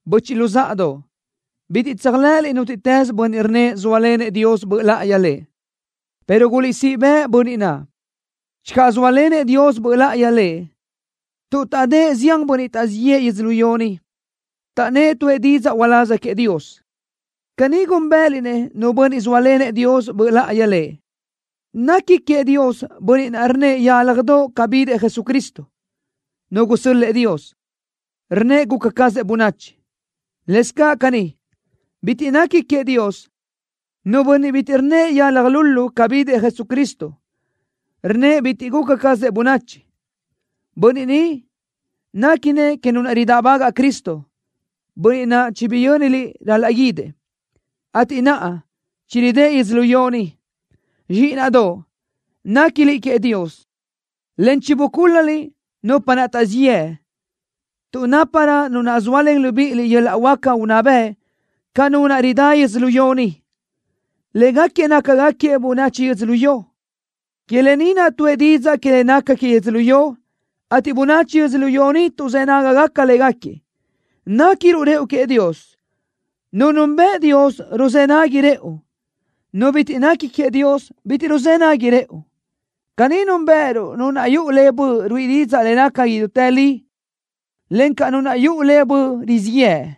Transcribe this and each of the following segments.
Böchiʼ luzáʼadoʼ, bitiʼ tséajlëʼëliʼ nútiʼtës bönniʼ rnnëʼ zóalenëʼ Dios Böʼ Láʼayi lëʼ, pero guliʼsíʼ bëʼ bönniʼ naʼ, channö zóalenëʼ Dios Böʼ Láʼayi lëʼ, tuʼ taʼdë́ʼ zián bönniʼ taʼzíʼ yëʼë yödzölió ni. Taʼnnë́ʼ tuʼë didzaʼ uláz queëʼ Dios. Caní gúnbëʼëliʼ-nëʼ nu bönniʼ zóalenëʼ Dios Böʼ Láʼayi lëʼ. Nequi queëʼ Dios bönniʼ naʼ rnnëʼ yálajdoʼ ca bidëʼ Jesucristo, Nu gusö́l-lëʼë Dios, rnnëʼ guca cazëʼ bönachi. Lëscaʼ caní, bitiʼ nequi queëʼ Dios nu bönniʼ bitiʼ rnnëʼ yalaj lulu ca bidëʼ Jesucristo, rnnëʼ bitiʼ guca cazëʼ bönachi. Bönniʼ ni néquinëʼ que nu naʼ ridáʼbagaʼ Cristo, bönniʼ naʼ chibiyö́niliʼ ral-laʼ guídëʼ, ateʼ naʼa chiridë́ʼ yödzölió ni. Zxíʼinaʼdoʼ, néquiliʼ queëʼ Dios, en chibucúl-laliʼ nupa naʼ taʼzíʼ yëʼ, tuʼ náparö Nu naʼ zóalen libíʼiliʼ yöl-laʼ huáca unná bëʼ ca nu naʼ ridá yödzölió ni. Légaquiëʼ nácagaquiëʼ bönachi yödzölió. Que lë ni naʼ tuʼë didzaʼ que le naca que yödzölió, ateʼ bönachi yödzölió ni tuʼzë́ nágagaca légaquiëʼ. Néquiruʼ rëʼu queëʼ Dios. Nu nunbëʼ Dios ruzë́ nagui rëʼu. Nu bitiʼ nequi queëʼ Dios bitiʼ ruzë́ nagui rëʼu. Caní núnbëʼëruʼ nu naʼ yuʼu le Böʼ ruíʼi didzaʼ le naca idútë li, encaʼ nu naʼ yuʼu le tu böʼ rizíʼ yëʼ.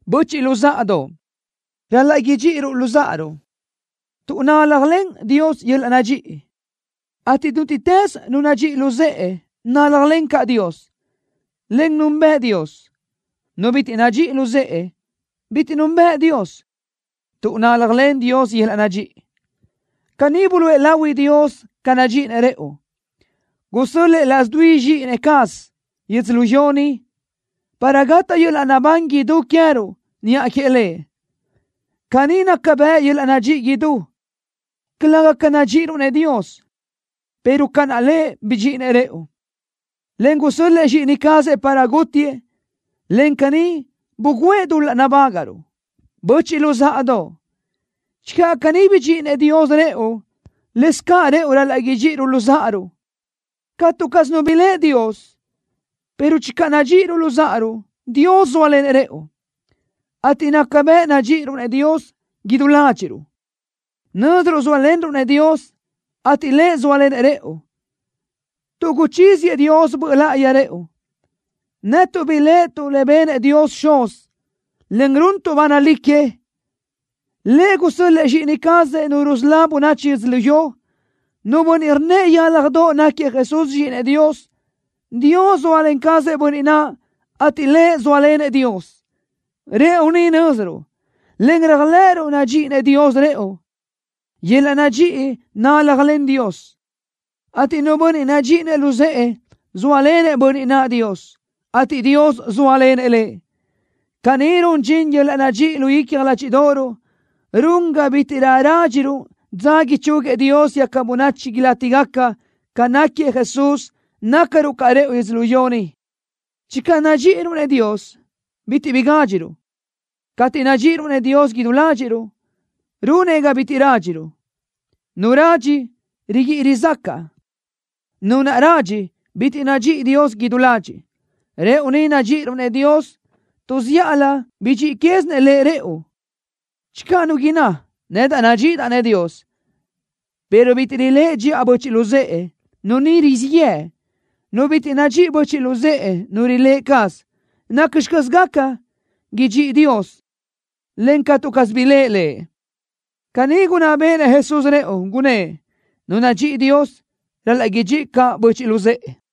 Böchiʼ luzáʼadoʼ, ral-laʼ idxíʼiruʼ luzáʼaruʼ, tuʼ náljalen Dios yöl-laʼ nadxíʼi, ateʼ nútiʼtës nu nadxíʼi luzë́ʼe náljalen caʼ Dios, en núnbeʼe Dios. Nu bitiʼ nadxíʼi luzë́ʼe, bitiʼ núnbeʼe Dios, tuʼ náljalen Dios yöl-laʼ nadxíʼi. Caní buluʼe lahui Dios ca nadxíʼinëʼ rëʼu, gusö́l-lëʼë laʼs dui Zxíʼini cazëʼ yödzölió ni, para gataʼ yöl-laʼ naʼbán idú queë́ruʼ niʼa queëʼ Lëʼ. Caní naca bëʼ yöl-laʼ nadxíʼi idú, calëga ca nadxíʼiruʼ-nëʼ Dios, pero ca naʼ Lëʼ bidxíʼinëʼ rëʼu, en gusö́l-lëʼë Zxíʼini cazëʼ para gútiëʼ, en caní bugǘëʼ dul-laʼ nabágaʼruʼ. Böchiʼ luzáʼadoʼ, channö caní bidxíʼideʼenëʼ Dios rëʼu, lëscaʼ rëʼu ral-laʼ idxíʼiruʼ luzáʼaruʼ. Catu caz nu biléʼe Dios, pero channö nadxíʼiruʼ luzáʼaruʼ, Dios zóalenëʼ rëʼu, ateʼ naca bëʼ nadxíʼiruʼ-nëʼ Dios idú ládxiʼruʼ. Nö́ziruʼ zóalenruʼ-nëʼ Dios, ateʼ Lëʼ zóalenëʼ rëʼu, tuʼ guchíziëʼ Dios Böʼ Láʼayi rëʼu. Netuʼ biléʼetuʼ le benëʼ Dios Xuz, en runtuʼ ba nalí que. Lëʼ gusö́l-lëʼë Zxíʼini cazëʼ Nu rusölá bönachi yödzölió. Nu bönniʼ rnnëʼ yálajdoʼ náquiëʼ Jesús Zxíʼinëʼ Dios, Dios zóalen cazëʼ bönniʼ naʼ, ateʼ lëʼ zóalenëʼ Dios. Rëʼu ni nö́ziruʼ, en réajlëʼëruʼ nadxíʼinëʼ Dios rëʼu. Yöl-laʼ nadxíʼi náljalen Dios, ateʼ nu bönniʼ nadxíʼinëʼ luzë́ʼë, zóalenëʼ bönniʼ naʼ Dios, ateʼ Dios zóalenëʼ lëʼ. Caní run dxin yöl-laʼ nadxíʼi lu icja ládxiʼdoʼoruʼ, run ga bítiʼrö rádxiruʼ dza ichúguiëʼ Dios quégaca bönachi ilátigaca. Ca náquiëʼ Jesús, nácaruʼ caʼ rëʼu yödzölió ni. Channö nadxíʼiruʼ-nëʼ Dios, bitiʼ bi gádxiruʼ. Cateʼ nadxíʼiruʼ-nëʼ Dios idú ládxiʼruʼ, runëʼ ga bitiʼ rádxiruʼ. Nu radxi, riguíʼi rizácaʼa. Nu naʼ radxi, bitiʼ nadxíʼi Dios idú ladxiʼ. Rëʼu ni nadxíʼiruʼ-nëʼ Dios, tuʼ zíʼalö bidxíʼi quézinëʼ Lëʼ rëʼu. Channö nu inná: “Nedaʼ nadxíʼidaʼ-nëʼ Dios”, pero bitiʼ riléʼe dxiʼa böchiʼ luzë́ʼe, nu ni rizíʼ yëʼ. Nu bitiʼ nadxíʼi böchiʼ luzë́ʼe nu riléʼe caz, ¿nacxi caz gaca idxíʼi Dios, en catu caz biléʼe Lëʼ? Caní gunná béʼenëʼ Jesús rëʼu. Gunnë́ʼ: Nu nadxíʼi Dios, ral-laʼ idxíʼi caʼ böchiʼ luzë́ʼe.